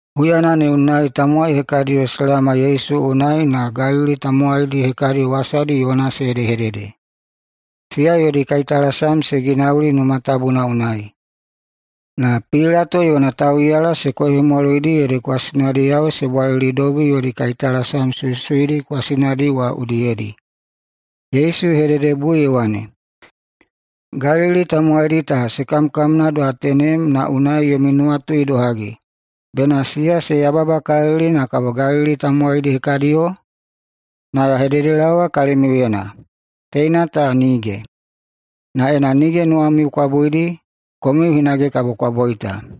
Huyana ne unai tamowai hekadiyo se laoma Yesu unai na Galili tamowaidi hekadi wasadi yona se hedehedede. Siya yodi kaitalasam se ginauli Numa Tabuna unai, na Pilato yona tauꞌiyala se koihemwaloidi ede kwasinadiyao se bwalilidobi yodi kaitalasam suisuidi kwasinadi wa udiyedi. Yesu ye hededebui ye wane, “Galili tamowaidi ta se kamkamna doha tenem na unai yomi nuwatu idohagi, bena siya se yababakalili na kabo Galili tamowaidi hekadiyo? Na ya hededelaowa kalimiuyena, teina ta nige! Na ena nige nuwamiu kwa buidi, komiu hinage kabo kwa boita.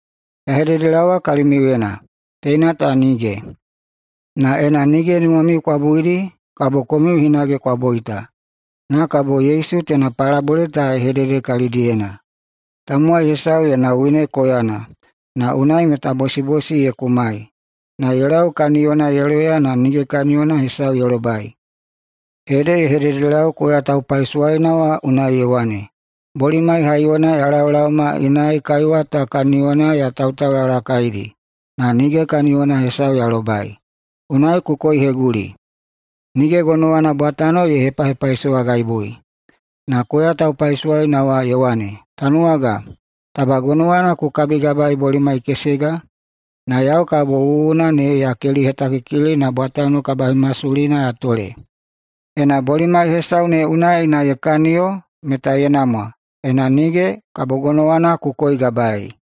Ya hededelaowa kalimiuyena, teina ta nige! Na ena nige nuwamiu kwa buidi, kabo komiu hinage kwa boita.” Na kabo Yesu teina palabole ta ye hedede kalidiyena: “Tamowai hesau yona wine koyana, na unai meta bosibosi ye kumai. Na ye lau kaniyona ye loya na nige kaniyona hesau ye lobai. Ede ye hededelau koya taupaisowaina wa unai ye wane, ‘Bolimai haiyona ya laolaoma inai kaiwa ta kaniyona ya tautaulalakaidi na nige kaniyona hesau ya lobai. Unai ku koiheguli. Nige gonowana bwatano ye hepahepaisowagaibui.’ Na koya taupaisowaina wa ye wane, ‘Tanuwaga, taba gonowana ku kitagabaei bolimai kesega, na yau kabo wuwuna ne ya kelihetakikili na bwatano kabahemasulina ya tole. Ena bolimai hesau ne unai na ye kaniyo meta ye namwa, ena nige, kabo gonowana ku koigabaei.’”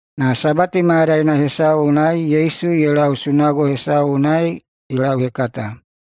Na Sabati mayadaina hesau unai Yesu ye lau sunago hesau unai ye lauhekata.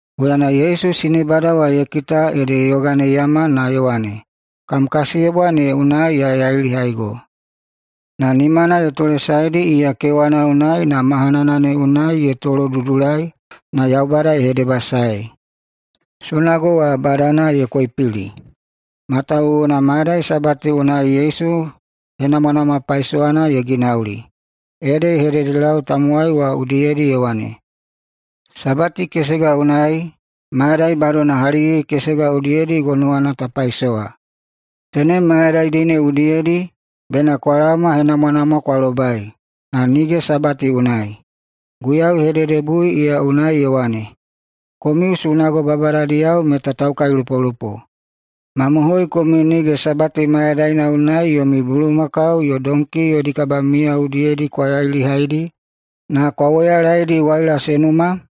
Huyana Yesu sinebada wa ye kita ede ye yoganeiyama na ye wane, “Kam kasiyebwa ne unai ya yailihaigo.” Na nimana ye tolesaedi iya kewana unai na mahanana ne unai ye tolodudulai na Yaubada ye hedebasaei. Sunago wa badana ye koipili matawuwuna mayadai Sabati unai Yesu henamwanamwa paisowana ye ginauli, ede ye hedehededelau tamowai wa udiyedi ye wane, “Sabati kesega unai mayadai badona haligigi-kesega udiyedi gonowana ta paisowa. Tenem mayadaidi ne udiyedi bena kwa laoma henamwanamwa kwa lobai, na nige Sabati unai.” Guiyau ye hededebui iya unai ye wane, “Komiu sunago babadadiyao meta taukailupolupo. Mamohoi, komiu nige Sabati mayadaina unai yomi bulumakau yo donki yodi kabamiya udiyedi kwa yailihaidi na kwa woyalaedi waila se numa?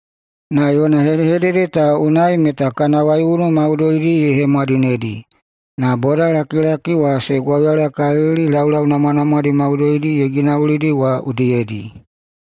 Na yona hedehedede ta unai meta kana waiunu maudoidi ye hemwadinedi. Na bodalakilaki wa se gwauyalakalili laulau namwanamwadi maudoidi ye ginaulidi wa udiyedi.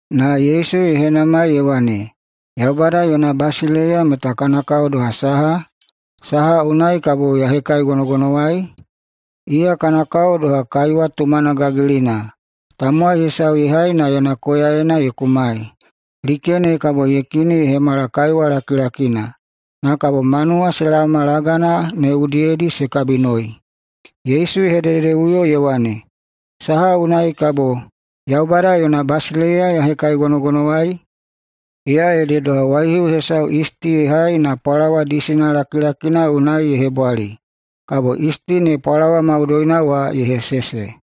Na Yesu ye henamai ye wane, “Yaubada yona basileiya meta kana kao doha saha? Saha unai kabo ya hekaigonogonowai? Iya kana kao doha kaiwa tumana gagilina tamowai hesau ye hai na yona koyaena ye kumai. Like ne kabo ye kini ye hemala kaiwa lakilakina, kabo manuwa se laoma lagana ne udiyedi se kabinoi.” Yesu ye hedehededeꞌuyo ye wane, “Saha unai kabo Yaubada yona basileiya ya hekaigonogonowai? Iya ede doha waihiu hesau yisti ye hai na pwalawa disina lakilakina unai ye hebwali. Kabo yisti ne pwalawa maudoina wa ye hesese.”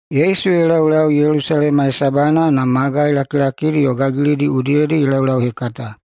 Yesu ye laulau Yelusalema hesabana na magai lakilakidi yo gagilidi udiyedi ye laulauhekata.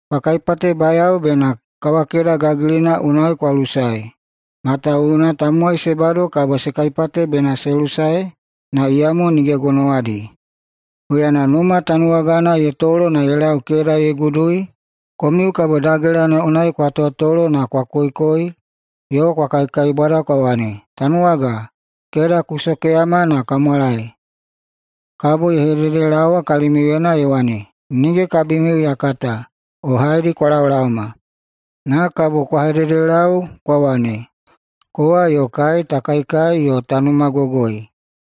“Kwa kaipatebayao bena kawakeda gagilina unai kwa lusae, matawuwuna tamowai se bado kabo se kaipate bena se lusae na iyamo nige gonowadi. Huyana numa tanuwagana ye tolo na ye lau keda ye gudui, komiu kabo dagela ne unai kwa tolo na kwa koikoi yo kwa kaikaibwada kwa wane, ‘Tanuwaga, keda ku sokeyama na ka mwalaewa!’ Kabo ye hededelaowa kalimiuyena ye wane, ‘Nige kabimiu ya kata o haedi kwa laolaoma.’ Na kabo kwa hededelau kwa wane, ‘Kowa yo kai ta kaikai yo ta numagogoi,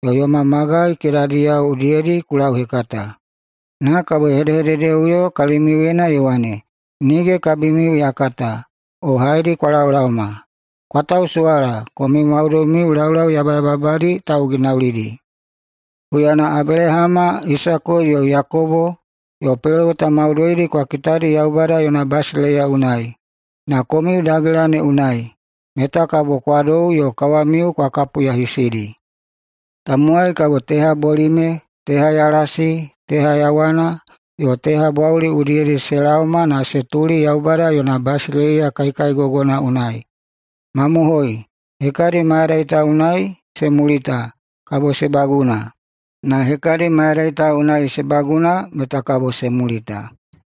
yo yoma magai kedadiyao udiyedi ku lauhekata.’ Na kabo ye hedehededeꞌuyo kalimiuyena ye wane, ‘Nige kabimiu ya kata o haedi kwa laolaoma. Kwa tausuwala, komiu maudoimiu laulau yabayababadi tauginaulidi!’ Huyana Abelahama, Isako yo Yakobo yo peloweta maudoidi kwa kitadi Yaubada yona basileiya unai, na komiu dagela ne unai, meta kabo kwa dou yo kawamiu kwa kapuyahisidi. Tamowai kabo teha bolime, teha yalasi, teha yawana, yo teha bwauli udiyedi se laoma na se tuli Yaubada yona basileiya kaikaigogona unai. Mamohoi! Hekadi mayadai ta unai se mulita kabo se baguna, na hekadi mayadai ta unai se baguna meta kabo se mulita.”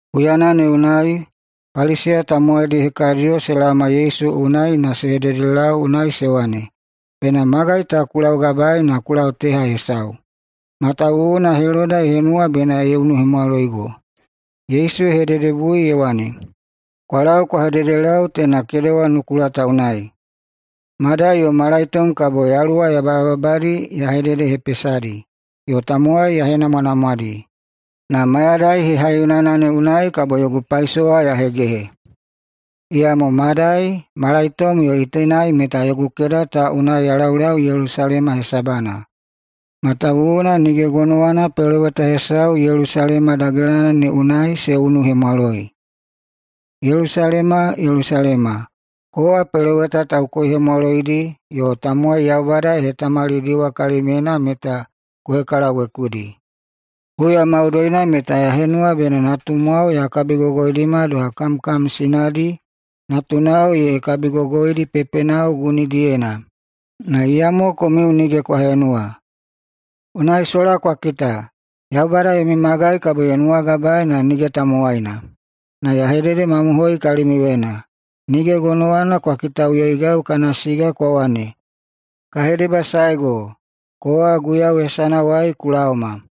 Huyana ne unai Paliseya tamowaidi hekadiyo se laoma Yesu unai na se hededelau unai se wane, “Bena magai ta ku laugabaei na ku lau teha hesau, matawuwuna Heloda ye henuwa bena ye unuhemwaloigo.” Yesu ye hededebui ye wane, “Kwa lau kwa hededelau teina kedewa nukula ta unai: Madai yo malaitom kabo yaluwa yabayababadi ya hededehepesadi yo tamowai ya henamwanamwadi, na mayadai hehaiyonana ne unai kabo yogu paisowa ya hegehe. Iyamo madai, malaitom yo itenai meta yogu keda ta unai ya laulau Yelusalema hesabana, matawuwuna nige gonowana peloweta hesau Yelusalema dagelana ne unai se unuhemwaloi. Yelusalema, Yelusalema! Kowa peloweta taukoihemwaloidi yo tamowai Yaubada ye hetamalidiwa kalimyena meta ku hekalawekudi. Huya maudoina meta ya henuwa bena natumwao ya kabigogoidima doha kamkam sinadi natunao ye kabigogoidi pepenao gunidiyena, na iyamo komiu nige kwa henuwa. Unai sola kwa kita, Yaubada yomi magai kabo ye nuwagabaei na nige tamowaina. Na ya hededemamohoi kalimiuyena: Nige gonowana kwa kitaꞌuyoigau kana siga kwa wane, ‘Ka hedebasaego, kowa Guiyau hesanawai ku laoma!’”